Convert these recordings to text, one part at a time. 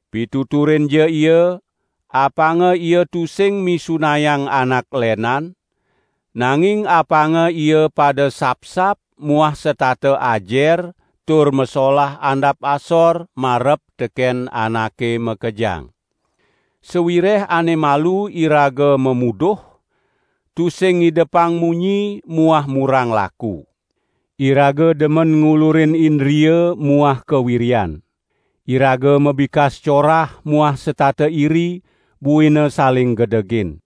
Pituturinja ia, apanga ia tusing misunayang anak lenan, nanging apanga ia pada sapsap muah setata ajer tur masolah andap asor marep teken anake makejang. Sawireh ane malu iraga mamuduh, tusing ngidepang munyi muah murang laku. Iraga demen ngulurin indria muah kawiryan. Iraga mabikas corah muah setata iri, buina saling gedegin.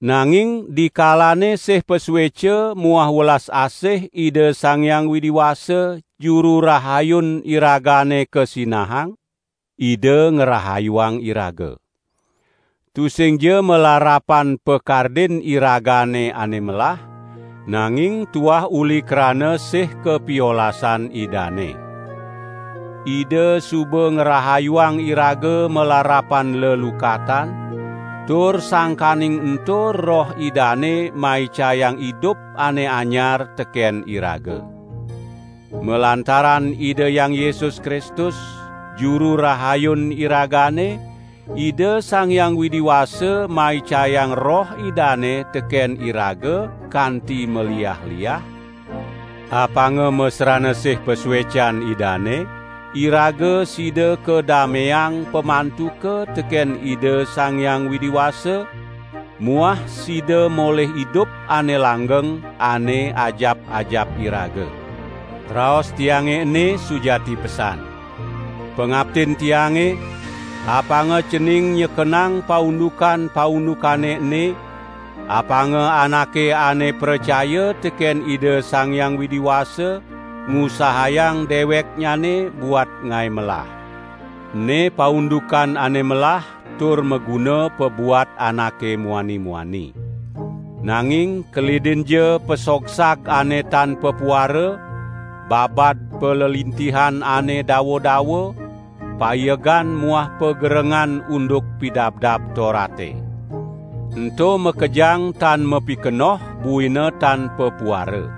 Nanging dikalane sih pasueca muah welas asih Ida Sang Hyang Widi Wasa, Juru Rahayun iragane kasinahang, Ida ngrahayuang iraga. Tusingja malarapan pakardin iragane ane melah, nanging tuah uli krana sih kapiolasan Idane. Ida suba ngrahayuang iraga malarapan lelukatan, tur sangkaning ento Roh Idane maicayang idup ane anyar teken iraga. Malantaran Ida Hyang Yesus Kristus, Juru Rahayun iragane, Ida Sang Hyang Widi Wasa maicayang Roh Idane teken iraga kanti maliah-liah, apanga masrana sih pasuecan Idane, iraga sida kadameang pamantuka teken Ida Sang Hyang Widi Wasa muah sida molih idup ane langgeng, ane ajap-ajap iraga. Raos tiange ene sujati pesan. Pangaptin tiange, apanga cening nyekenang paundukan-paundukane ene, apanga anake ane pracaya teken Ida Sang Hyang Widi Wasa ngusahayang deweknyane buat ngae melah. Ene paundukan ane melah tur maguna pabuat anake muani-muani. Nanging kelidinja pasogsag ane tan papuara, babad palelintihan ane dawa-dawa, paiegan muah pagerengan unduk Pidabdab Torate. Ento makejang tan mapikenoh buina tan papuara.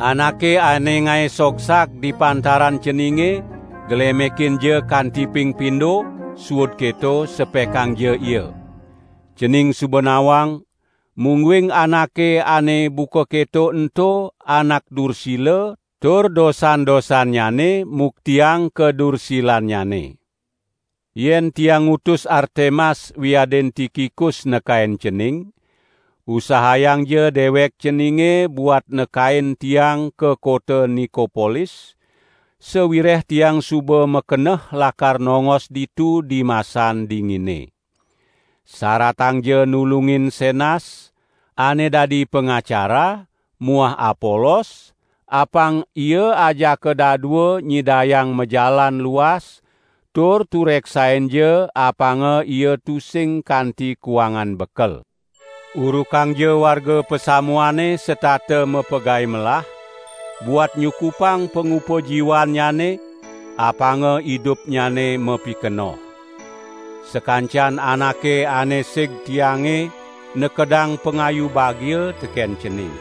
Anake ane ngae sogsag di pantaran ceninge glemekinja kanti ping pindo, suud keto sepekangja ia. Cening suba nawang, mungguing anake ane buka keto ento anak dursila tur dosan-dosannyane muktiang kadursilannyane. Yen tiang ngutus Artemas wiadin Tikikus nekain cening, usahayangja dewek ceninge buat nekain tiang ka kota Nikopolis, sawireh tiang suba makeneh lakar nongos ditu dimasan dingine. Saratangja nulungin Senas, ane dadi pangacara muah Apolos, apang ia ajaka dadua nyidayang majalan luas, tur tureksainja apanga ia tusing kanti kuangan bekel. Urukangja warga pasamuane setata mapagae melah, buat nyukupang pangupajiwannyane; apanga idupnyane mapikenoh. Sakancan anake ane sig tiange nekedang pangayu bagia teken cening.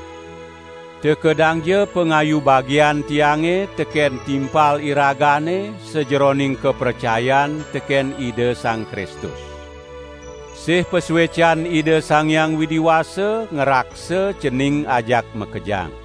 Tekedangja pangayu bagian tiange teken timpal iragane sajeroning kapracayan teken Ida Sang Kristus. Sih pasuecan Ida Sang Hyang Widi Wasa ngraksa cening ajak makejang.